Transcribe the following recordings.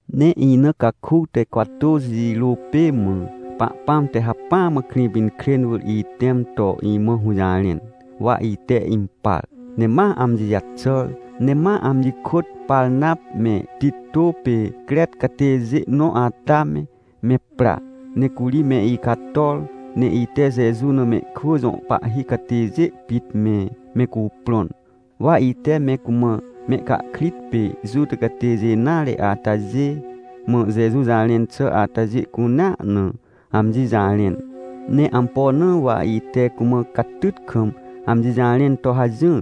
Ne ina caku te cwatôxi jirô pê mã, Pahpãm te hacpỹa mã Krĩpinkrên wỳr itẽm to imã hũjarẽn, wa ite impar, ne ma amji jaxàr. Ne ma amji kôt Parnap me Tito pê Crec catêjê nõ ata me, me pra, ne curi me icator. Ne ite Jeju na mehkwỳ jõ pahhi catêjê pit me, me cuprõn, wa ite me cumã mehcahkrit pê Juta catêjê nare atajê, mã Jeju jarẽn xà atajê cunea na, amji jarẽn. Ne ampo na wa ite cumã catyt kam amji jarẽn to hajỹr?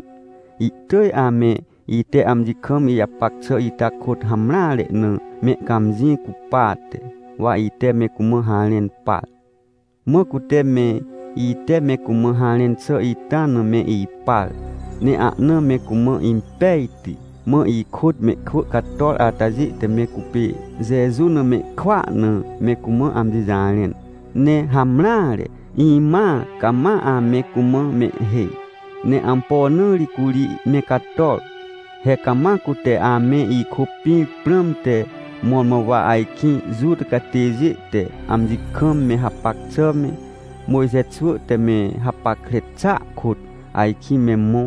Ihtỳj ame ite amji kam ijapac xà ita kôt hamreare na mehcãmjĩ cupate, wa ite me cumã harẽn par. Mã cute me, ite me cumã harẽn xà ita na me ipar, ne ahna me cumã impejti. Mã ikôt mehkwỳ cator atajê te me cupê Jeju na mehkwỳa na me cumã amji jarẽn. Ne hamreare, imãa cama ame cumã mehhêj. Ne ampo na ri curi me cator? He cama cute ame ikôpĩr prãmte, mõrmõ wa ajkĩ Juta catêjê te amji kam me hapac xà me, Mojxe xwỳ te me hapackre xàa kôt, ajkĩ me mõ.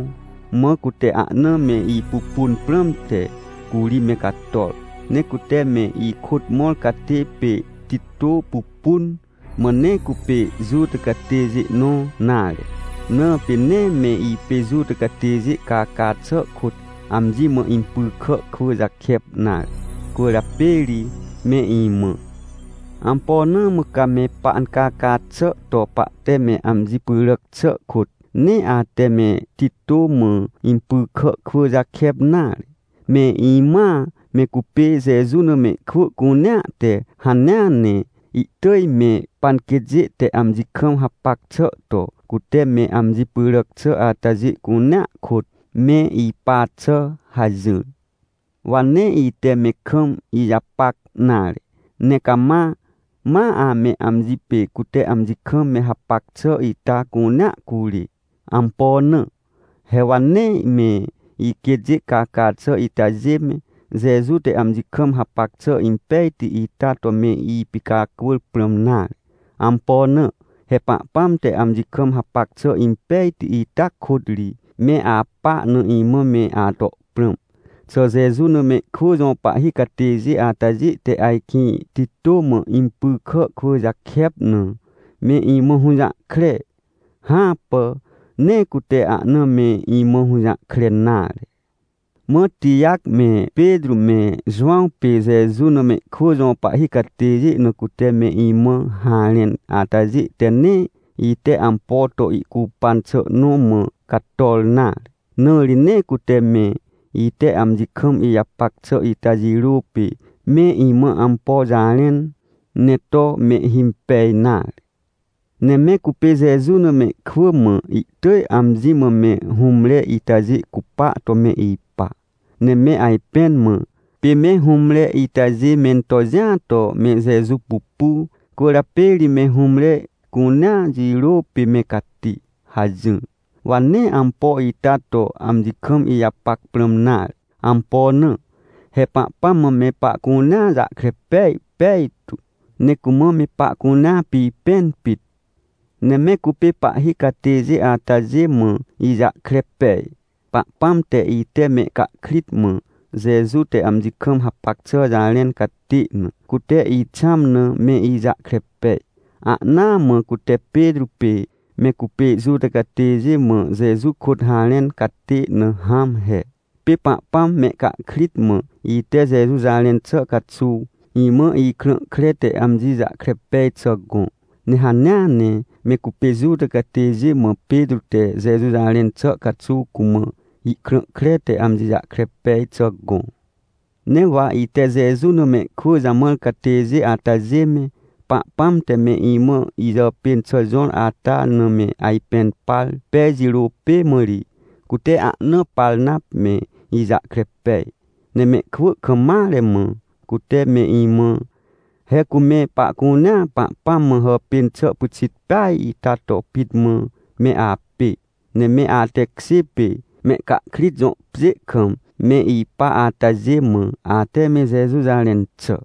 Mã cute ahna me ipupun prãmte, curi me cator. Ne cute me ikôt mõr catê pê Tito pupun, mã nee cupê Juta catêjê nõ nare, na pê nee me ipê Juta catêjê caca xà kôt amji mã impy kà kwỳ jakep nare. Cwỳrjapê ri me imã: — Ampo na mã ca me pancaca xà to pahte me amji pyràc xà kôt, nee ate me Tito mã impy kà kwỳ jakep nare? Me imãa, me cupê Jeju na mehkwỳ cunea te hanea ne ihtỳj me panquêtjê te amji kam hapac xà to, cute me amji pyràc xà atajê cunea kôt me ipa xà — hajỹr. Wa nee ite me kam ijapac nare, ne cama, ma ame amji pê cute amji kam me hapac xà ita cunea curê. Ampo na? He wa nee me iquêtjê caca xà itajê me, Jeju te amji kam hapac xà impejti ita to me ipicacwỳr prãm nare. Ampo na? He Pahpãm te amji kam hapac xà impejti ita kôt ri, me apa na imã me ato prãm. Xà Jeju na mehkwỳ jõ pahhi catêjê atajê te ajkĩ Tito mã impy kà kwỳ jakep na, me imã hũjahkre? Hãpà! Nee cute ahna me imã hũjahkre nare! Mã Tijac me, Petrô me, Jowãw pê Jeju na mehkwỳ jõ pahhi catêjê na cute me imã harẽn atajê te nee, ite ampo to ihcupan xà nõ mã cator nare. Na ri nee cute me, ite amji kam ijapac xà ita jirô pê, me imã ampo jarẽn, ne to mehhimpej nare. Ne me cupê Jeju na mehkwỳ mã ihtỳj amji mã me hũmre itajê cupa to me ipa, ne me ajpẽn mã: — Pê me hũmre itajê mento jĩa to me Jeju pupu, cwỳrjapê ri me hũmre cunea jirô pê me cati — hajỹr. Wa nee ampo ita to amji kam ijapac prãm nare. Ampo na? He Pahpãm mã me pahcunea jahkre pej pejtu, ne cumã me pahcunea pipẽn pit. Ne me cupê pahhi catêjê atajê mã ijahkre pej, Pahpãm te ite mehcahkrit mã, Jeju te amji kam hapac xà jarẽn catê na, cute ixãm na me ijahkre pej, ahnaa mã cute Petrô, pê me cupê Juta catêjê mã Jeju kôt harẽn catê na hãm he. Pê Pahpãm mehcahkrit mã, ite Jeju jarẽn xà caxuw, imã ikrã kre te amji jahkre pej xà gõ. Ne hanea ne me cupê Juta catêjê mã Petrô te Jeju jarẽn xà caxuw cumã ihkrã kre te amji jahkre pej xà gõ. Ne wa ite Jeju na mehkwỳ jamãr catêjê atajê me, Pahpãm te me imã ijàpên xà jõr ata na me ajpẽn par pej jirô pê mã ri, cute ahna Parnap me ijahkre pej, ne mehkwỳ kam mare mã, cute me imã: — He cu me pahcunea Pahpãm mã hàpên xà pyxit peaj ita to pit mã me apê. Ne me atekjê pê, mehcahkrit jõ pjê kam me ipa atajê mã, ate me Jeju jarẽn xà.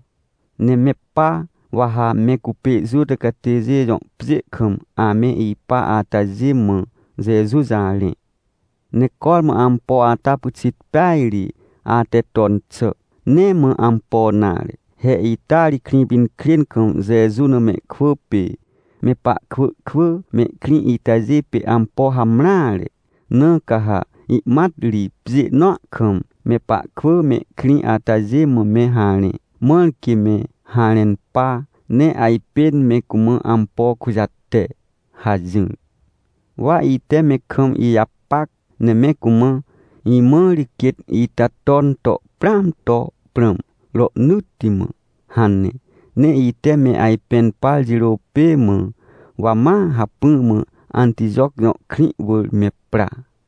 Ne me pa, wa ha me cupê Juta catêjê jõ pjê kam ame ipa atajê mã Jeju jarẽ. Ne cormã ampo ata pyxit peaj ri, ate ton xà. Nee mã ampo nare, he ita ri Krĩpinkrên kam Jeju na mehkwỳ pê, me pahkwỳ kwỳ mehkrĩ itajê pê ampo hamreare, na ca ha ihmat ri pjê nõa kam, me pahkwỳ mehkrĩ atajê mã me harẽ, mãr quê me harẽn pa, ne ajpên me cumã ampo kujate — hajỹr. Wa ite me kam ijapac, ne me cumã: — Imã ri quêt ita ton to prãam to prãm rohnỳtti mã — hane. Ne ite me ajpẽn par jirô pê mã, wa ma hacpỹ mã Antijoc jõ krĩ wỳr me pra.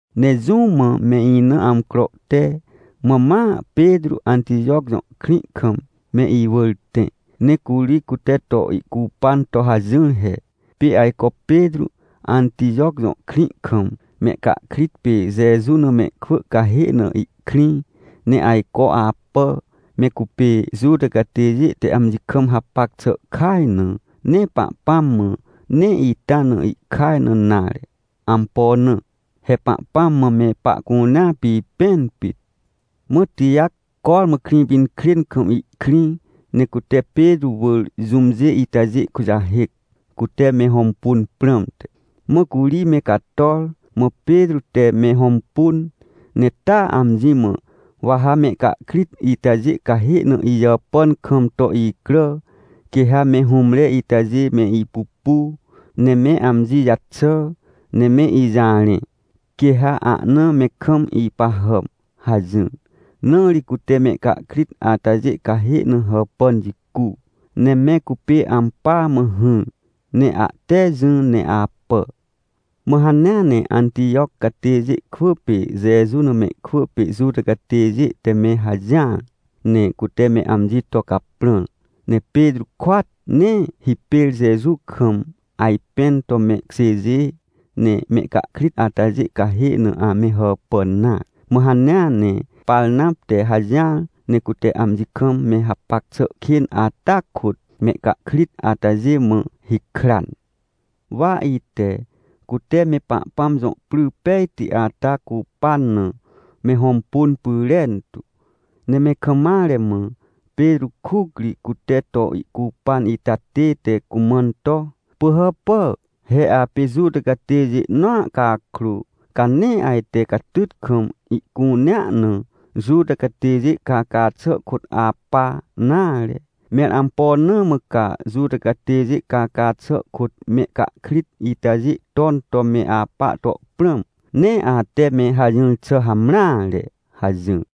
Ne jũ mã me ina amcro te, mã ma Petrô Antijoc jõ krĩ kam me iwỳr tẽ, ne curi cute to ihcupan to hajỹr he. Pê ajco Petrô Antijoc jõ krĩ kam, mehcahkrit pê Jeju na mehkwỳ cahê na ihkrĩ, ne ajco apà, me cupê Juta catêjê te amji kam hapac xà kaj na. Ne Pahpãm mã, nee ita na ihkaj na nare. Ampo na? He Pahpãm mã me pahcunea pipẽn pit. Mã Tijac cormã Krĩpinkrên kam ihkrĩ, ne cute Petrô wỳr jũmjê itajê kujahêc, cute me hõmpun prãmte. Mã curi me cator, mã Petrô te me hõmpun, ne taa amji mã: — Wa ha mehcahkrit itajê cahê na ijàpàn kam to icrà, quê ha me hũmre itajê me ipupu, ne me amji jaxà, ne me ijarẽ, quê ha ahna me kam ipahàm — hajỹr. Na ri cute mehcahkrit atajê cahê na hàpàn jicu, ne me cupê ampỳa mã hỹr, ne ahte jỹ ne apà. Mã hanea ne Antijoc catêjê kwỳ pê Jeju na mehkwỳ pê Juta catêjê te me hajỹar, ne cute me amji to caprãr, ne Petrô kôat, nee hipêr Jeju kam ajpẽn to mehkjêjê, ne mehcahkrit atajê cahê na ame hàpàn nare. Mã hanea ne Parnap te hajỹar, ne cute amji kam me hapac xà kên ata kôt, mehcahkrit atajê mã hikran. Wa ite, cute me Pahpãm jõ pry pejti ata cupan na, me hõmpun pyrentu, ne me kam mare mã, Petrô kuc ri, cute to ihcupan ita tête cumãn to: — Pỳhàpà! He apê Juta catêjê nõa cakrô, ca nee ajte catyt kam ihcunea na Juta catêjê caca xà kôt apa nare! Mẽr ampo na mã ca Juta catêjê caca xà kôt mehcahkrit itajê ton to me apa to prãm? Nee ate me hajỹr xà hamreare! — hajỹr.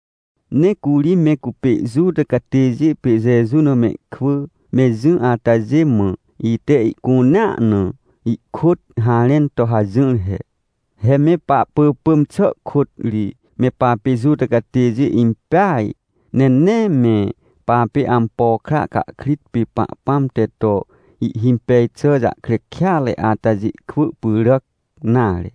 Ne curi me cupê Juta catêjê pê Jeju na mehkwỳ, me jỹ atajê mã, ite ihcunea na ihkôt harẽn to hajỹr he: — He me pahpỳpỳm xà kôt ri, me papê Juta catêjê impeaj, ne nee me papê ampo kra cahkrit pê Pahpãm te to ihhimpej xà jahkre kêatre atajê kwỳ pyràc nare.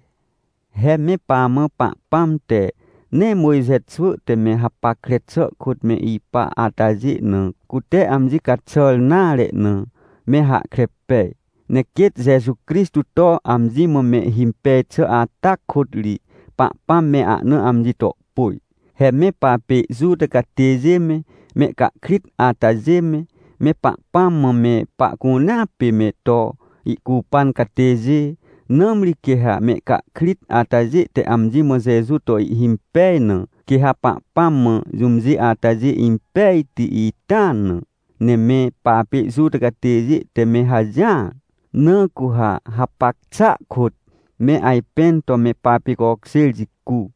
He me pamã Pahpãm te, nee Mojxe xwỳ te me hapackre xà kôt me ipa atajê na, cute amji caxàr nare na, me hahkre pej. Ne quêt Jeju Crixtô to amji mã mehhimpej xà ata kôt ri, Pahpãm me ahna amji to pôj. He me papê Juta catêjê me, mehcahkrit atajê me, me Pahpãm mã me pahcunea pê, me to ihcupan catêjê. Nãmri quê ha mehcahkrit atajê te amji mã Jeju to ihhimpej na, quê ha Pahpãm mã jũmjê atajê impejti ita na. Ne me papê Juta catêjê te me hajỹar. Na cu ha hapac xàa kôt, me ajpẽn to me papicokjêr jicu,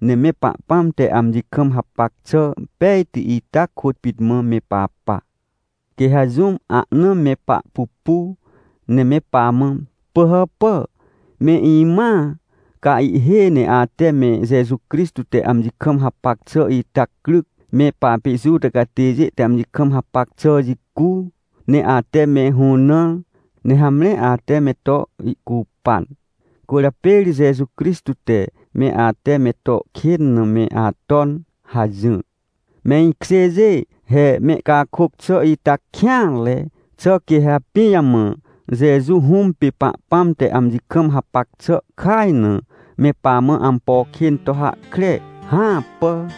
ne me Pahpãm te amji kam hapac xà pejti ita kôt pit mã me papa. Quê ha jũm ahna me pahpupu, ne me pamã: “Pỳhàpà, me imãa, ca ihhêj ne ate me Jeju Crixtô te amji kam hapac xà ita cryc, me papê Juta catêjê te amji kam hapac xà jicu, ne ate me hũnãr, ne hamre ate me to ihcupan. Cwỳrjapê ri Jeju Crixtô te, me ate me to kên na me aton” hajỹr. Me ikjêjê, he mehcakôc xà ita kêanre. Xà quê ha pijamã Jeju Hũm pê Pahpãm te amji kam hapac xà kaj na, me pamã ampo kên to hahkre? Hãpà!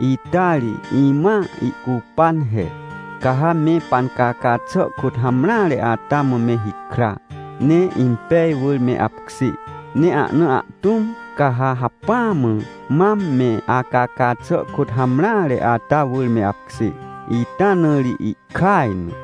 Ita ri, imãa ihcupan he. Ca ha me pancaca xà kôt hamreare ata mã me hikra, ne impej wỳr me apkjê, ne ana ahtũm, ca ha hacpỹa mã, mam me acaca xà kôt hamreare ata wỳr me apkjê, ita na ri ihkaj na.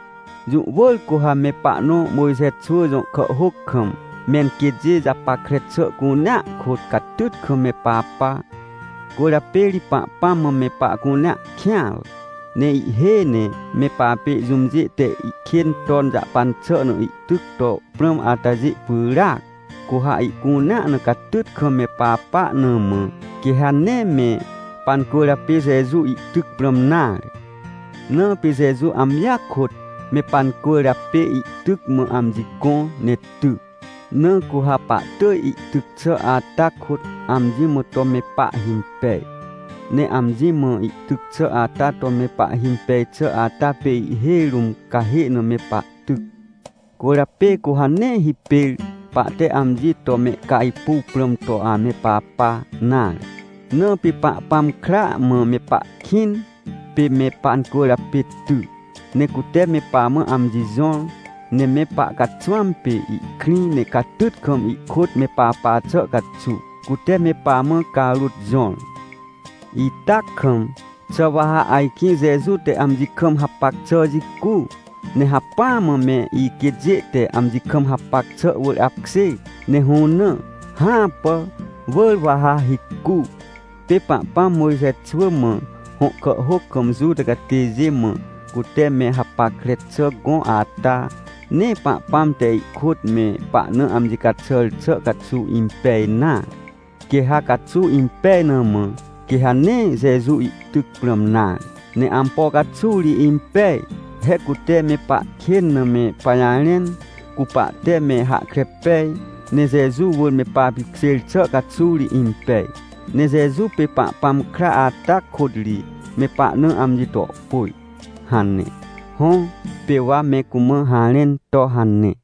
— Jũ wỳr cu ha me pahnõ Mojxe xwỳ jõ kàhhôc kam, menquêtjê japackre xà cunea kôt, catyt kam me papa. Cwỳrjapê ri Pahpãm mã me pahcunea kêanre, ne ihhêj ne me papê jũmjê te ihkên ton jahpan xà na ihtyc to prãm atajê pyràac. Cu ha ihcunea na catyt kam me papa na mã, quê ha nee me pancwỳrjapê Jeju ihtyc prãm nare. Na pê Jeju amjia kôt me pancwỳrjapê ihtyc mã amji gõ ne ty, na cu ha pahtỳj ihtyc xà ata kôt amji mã to me pahhimpej. Ne amji mã ihtyc xà ata to me pahhimpej xà ata pê ihhêj rũm cahê na me pahtyc. Cwỳrjapê cu ha nee hipêr, pahte amji to mehcajpuw prãm to ame papa nare. Na pê Pahpãm kra mã me pahkĩn, pê me pancwỳrjapê ty, ne cute me pamã amji jõr, ne me pahcaxwãm pê ihkrĩ, ne catyt kam ihkôt me papa xà caxuw, cute me pamã carôt jõr. Ita kam, xà wa ha ajkĩ Jeju te amji kam hapac xà jicu, ne hacpỹa mã me iquêtjê te amji kam hapac xà wỳr apkjê ne hũnã? Hãpà! Wỳr wa ha hicu! — Pê Pahpãm Mojxe xwỳ mã hõ kàhhôc kam Juta catêjê mã, cute me hapackre xà gõ ata, nee Pahpãm te ihkôt me pahna amji caxàr xà caxuw impej nare. Quê ha caxuw impej na mã, quê ha nee Jeju ihtyc prãm nare. Ne ampo caxuw ri impej? He cute me pahkên na me pajarẽn, cu pahte me hahkre pej, ne Jeju wỳr me papipkjêr xà caxuw ri impej. Ne Jeju pê Pahpãm kra ata kôt ri, me pahna amji to pôj — hane. Hõ, pê wa me cumã harẽn to hane.